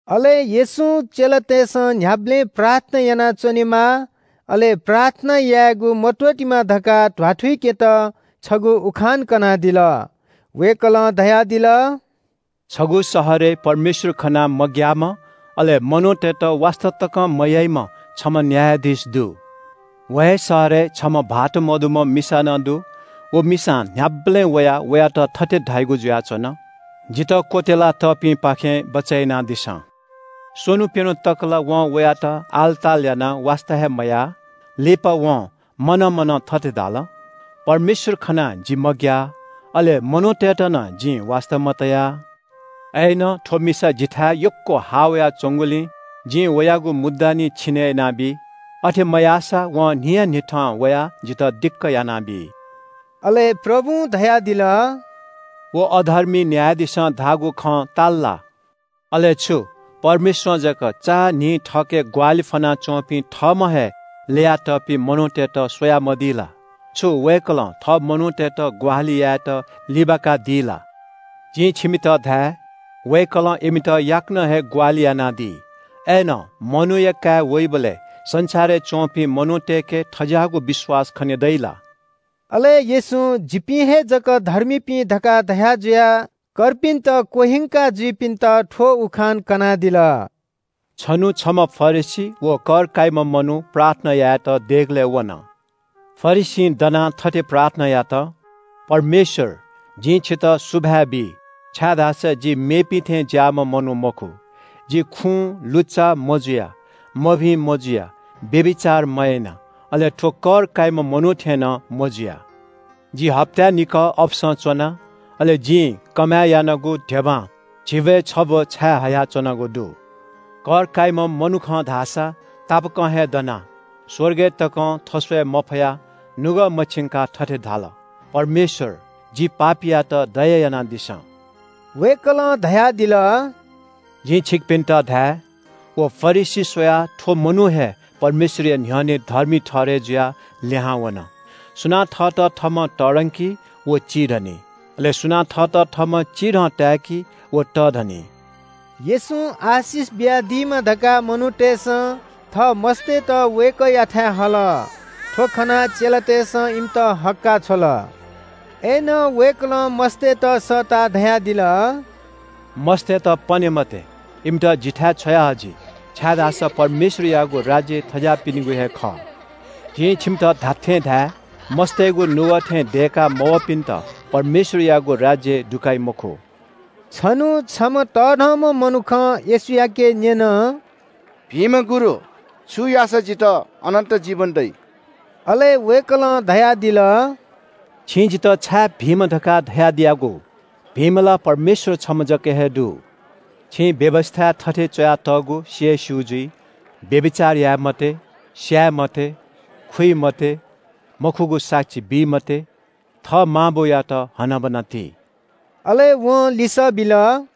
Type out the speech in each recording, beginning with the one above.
अले येशूं चेलातय्‌सं न्‍ह्याबलें प्रार्थना यानाच्‍वनेमा, अले प्रार्थना यायेगु मत्‍वःतेमा धकाः ध्‍वाथुइकेत छगू उखान कनादिल। वय्‌कलं धयादिल – “छगू शहरय् परमेश्‍वर खनाः मग्‍याःम्‍ह, अले मनूतय्‌त वास्‍ता तकं मयाइम्‍ह छम्‍ह न्‍यायाधीश दु। व हे शहरय् छम्‍ह भाःत सीधुंकूम्‍ह मिसा नं दु। व मिसां न्‍ह्याबलें वयाः वयात थथे धाइगु जुयाच्‍वन – ‘जितः क्‍वत्‍यलातःपिनिगु न्‍ह्यःने न्‍याय यानादिसँ।’ स्‍वन्‍हु प्‍यन्‍हु तक ला वं वयात आलताल यानाः वास्‍ता हे मयाः। लिपा वं मनं मनं थथे धाल – ‘परमेश्‍वर खनाः जि मग्‍याः, अले मनूतय्‌त नं जिं वास्‍ता मतया। अय्‌नं थ्‍व मिसा जिथाय् यक्‍व हाः वयाच्‍वंगुलिं जिं वयागु मुद्दा निं छिने यानाबी। अथे मयाःसा वं न्‍हियान्‍हिथं वयाः जितः दिक्‍क यानाबी।’” अले प्रभुं धयादिल – “व अधर्मी न्‍यायाधीशं धाःगु खँ ताल ला? अले छु, परमेश्‍वरं जक चान्‍हि थःके ग्‍वाहालि फ्‍वनाच्‍वंपिं थःम्‍हं हे ल्‍ययातःपिं मनूतय्‌त स्‍वयामदी ला? छु वय्‌कलं थः मनूतय्‌त ग्‍वाहालि यायेत लिबाकादी ला? जिं छिमित धाये – वय्‌कलं इमित याकनं हे ग्‍वाहालि यानादी। अय्‌नं मनूया काय् वइबलय् संसारय् च्‍वंपिं मनूतय्‌के थज्‍याःगु विश्‍वास खने दइ ला?” अले येशूं – “जिपिं हे जक धर्मीपिं” धकाः धया जुयाः कर्पिन्‍त क्‍वह्यंका जुइपिन्‍त थ्‍व उखान कनादिल – “छन्‍हु छम्‍ह फरिसी व कर काइम्‍ह मनू प्रार्थना यायेत देगलय् वन। फरिसीं दनाः थथे प्रार्थना यात – ‘परमेश्‍वर, जिं छितः सुभाय् बी, छाय्‌धाःसा जि मेपिं थें ज्‍याःम्‍ह मनू मखु। जि खुँ लुच्‍चा मजुया, मभिं मजुया, व्‍यभिचार मयाना, अले थ्‍व कर काइम्‍ह मनू थें नं मजुया। जि हप्‍ताय् निकः अपसं च्‍वना, अले जिं कमय् यानागु धिबां झिब्‍वय् छब्‍व छायेहया च्‍वनागु दु।’ “कर काइम्‍ह मनुखं धाःसा तापाकं हे दनाः स्‍वर्गय् तकं थस्‍वये मफयाः नुगः मछिंकाः थथे धाल – ‘परमेश्‍वर, जि पापीयात दया यानादिसँ।’” वय्‌कलं धयादिल – “जिं छिकपिन्‍त धाये – व फरिसी स्‍वयाः थ्‍व मनू हे परमेश्‍वरया न्‍ह्यःने धर्मी ठहरय् जुयाः लिहां वन। सुनां थःत थःम्‍हं तःधंकी व चिधनी। अले सुनां थःत थःम्‍हं चिधं ताय्‌की व तःधनी।” येशूं आशिष बियादीमा धकाः मनूतय्‌सं थः मस्‍तय्‌त वय्‌कःयाथाय् हल। थ्‍व खनाः चेलातय्‌सं इमित हक्‍काः छ्वल। अय्‌नं वय्‌कलं मस्‍तय्‌त सःताः धयादिल – “मस्‍तय्‌त पने मते, इमित जिथाय् छ्वया हजि, छाय्‌धाःसा परमेश्‍वरयागु राज्‍य थज्‍याःपिनिगु हे खः। जिं छिमित धात्‍थें धाये – मस्‍तय्‌गु नुगः थें दय्‌का मवःपिन्‍त परमेश्‍वरयागु राज्‍यय् दुकाइ मखु।” छन्‍हु छम्‍ह तःधंम्‍ह मनुखं येशूयाके न्‍यन – “भिंम्‍ह गुरु, छु याःसा जितः अनन्‍त जीवन दइ?” अले वय्‌कलं धयादिल – “छिं जितः छाय् भिंम्‍ह धकाः धयादियागु? भिंम्‍ह ला परमेश्‍वर छम्‍ह जक हे दु। छिं व्‍यवस्‍थाय् थथे च्‍वयातःगु सि हे स्‍यू जुइ – ‘व्‍यभिचार याये मते, स्‍याये मते, खुइ मते, मखुगु साक्षी बी मते, थः मां बौयात हनाबना ति।’” अले वं लिसः बिल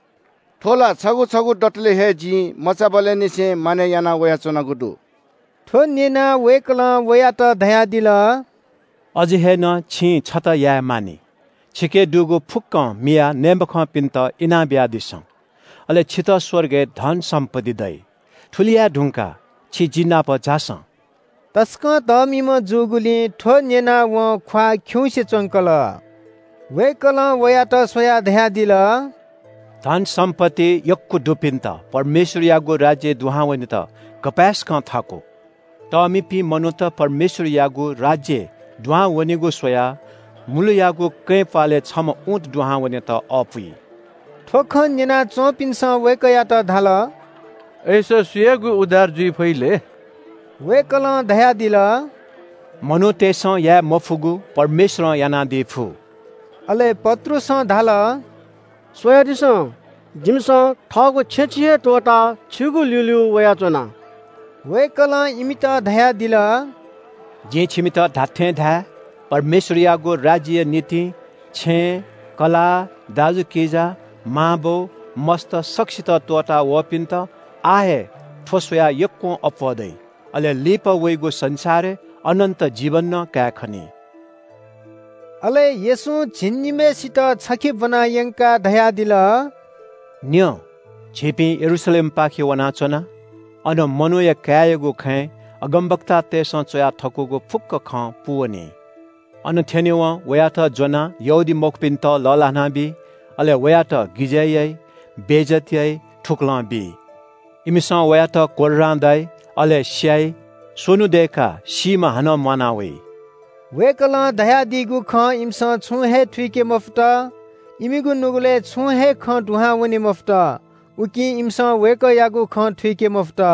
– “थ्‍व ला छगू छगू दतले हे जिं मचाबलय् निसें मानय् याना वयाच्‍वनागु दु।” थ्‍व न्‍यनाः वय्‌कलं वयात धयादिल – “अझ हे नं छिं छता याये मानि। छिके दुगु फुक्‍कं मियाः नये मखंपिन्‍त इनाबियादिसँ, अले छितः स्‍वर्गय् धन-सम्‍पत्ति दइ। थुलि याये धुंकाः छि जि नाप झासँ।” तसकं तःमिम्‍ह जूगुलिं थ्‍व न्‍यनाः वं ख्‍वाः खिउँसे च्‍वंकल। वय्‌कलं वयात स्‍वयाः धयादिल – “धन-सम्‍पत्ति यक्‍व दुपिन्‍त परमेश्‍वरयागु राज्‍यय् दुहां वनेत गपाय्‌सकं थाकु। तःमिपिं मनूत परमेश्‍वरयागु राज्‍यय् दुहां वनेगु स्‍वयाः मुलुयागु कँय् प्‍वालय् छम्‍ह ऊँट दुहां वनेत अःपुइ।” थ्‍व खँ न्‍यना च्‍वंपिन्‍सं वय्‌कःयात धाल – “अय्‌सा सुयागु उद्धार जुइ फइ लय्?” वय्‌कलं धयादिल – “मनूतय्‌सं याये मफुगु परमेश्‍वरं यानादी फु।” अले पत्रुसं धाल – “स्‍वयादिसँ, जिमिसं थःगु छेँछिँ हे त्‍वःताः छिगु ल्‍यूल्‍यू वयाच्‍वना।” वय्‌कलं इमित धयादिल – “जिं छिमित धात्‍थें धाये – परमेश्‍वरयागु राज्‍यया निंतिं छेँ, कलाः, दाजुकिजा, मांबौ, मस्‍त सकसित त्‍वःतावःपिन्‍त आः हे थ्‍व स्‍वयाः यक्‍वं अप्‍वः दइ, अले लिपा वइगु संसारय् अनन्‍त जीवन नं कायेखनी।” अले येशूं झिंनिम्‍हय्‌सित छखे ब्‍वना यंकाः धयादिल – “न्‍यँ, झीपिं यरूशलेमपाखे वनाच्‍वना। अन मनूया काय्‌यागु खँय् अगमवक्तातय्‌सं च्‍वया थकूगु फुक्‍क खँ पूवनी। अन थ्‍यनेवं वयात ज्‍वनाः यहूदीमखुपिन्‍त लःल्‍हानाबी, अले वयात गिजय् याइ, बेइज्‍जत याइ, थुकलं बी। इमिसं वयात कोर्रां दाइ, अले स्‍याइ। स्‍वन्‍हु दय्‌काः सीम्‍हं हानं म्‍वाना वइ।” वय्‌कलं धयादीगु खँ इमिसं छुं हे थुइके मफुत। इमिगु नुगलय् छुं हे खँ दुहां वने मफुत। उकिं इमिसं वय्‌कःयागु खँ थुइके मफुत।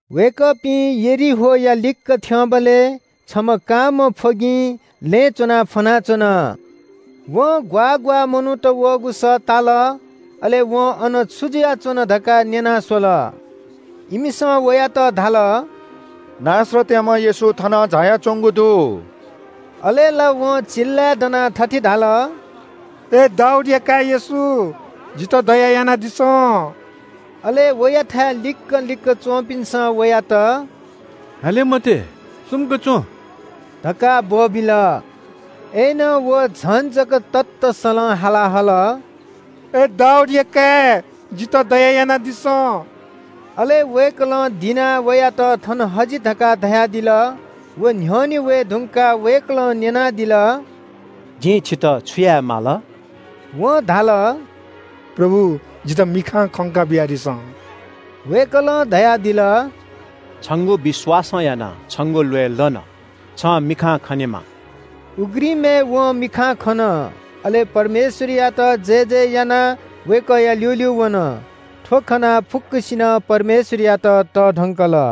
वय्‌कःपिं यरीहोया लिक्‍क थ्‍यंबलय् छम्‍ह कांम्‍ह फ्‍वगिं लँय् च्‍वनाः फ्‍वनाच्‍वन। वं ग्‍वाः ग्‍वाः मनूत वःगु सः ताल। अले वं अन छु जुयाच्‍वन धकाः न्‍यना स्‍वल। इमिसं वयात धाल – “नासरतयाम्‍ह येशू थनं झायाच्‍वंगु दु।” अले ला वं चिल्‍लाय् दनाः थथे धाल – “अय् दाऊदया काय् येशू, जितः दया यानादिसँ।” अले वयाथाय् लिक्‍क लिक्‍क च्‍वंपिन्‍सं वयात “हाले मते, सुम्‍क च्‍वँ” धकाः ब्‍वःबिल। अय्‌नं व झन जक ततःसलं हाला हल – “अय् दाऊदया काय्, जितः दया यानादिसँ।” अले वय्‌कलं दिनाः वयात “थन हजि” धकाः धयादिल। व न्‍ह्यःने वये धुंकाः वय्‌कलं न्‍यनादिल – “जिं छन्‍त छु याये माल?” वं धाल – “प्रभु, जितः मिखां खंका बियादिसँ।” वय्‌कलं धयादिल – “छंगु विश्‍वासं यानाः छंगु ल्‍वय् लन, छं मिखां खनेमा।” उघ्रिमय् वं मिखां खन। अले परमेश्‍वरयात जयजय यानाः वय्‌कःया ल्‍यूल्‍यू वन। थ्‍व खनाः फुक्‍कसिनं परमेश्‍वरयात तःधंकल।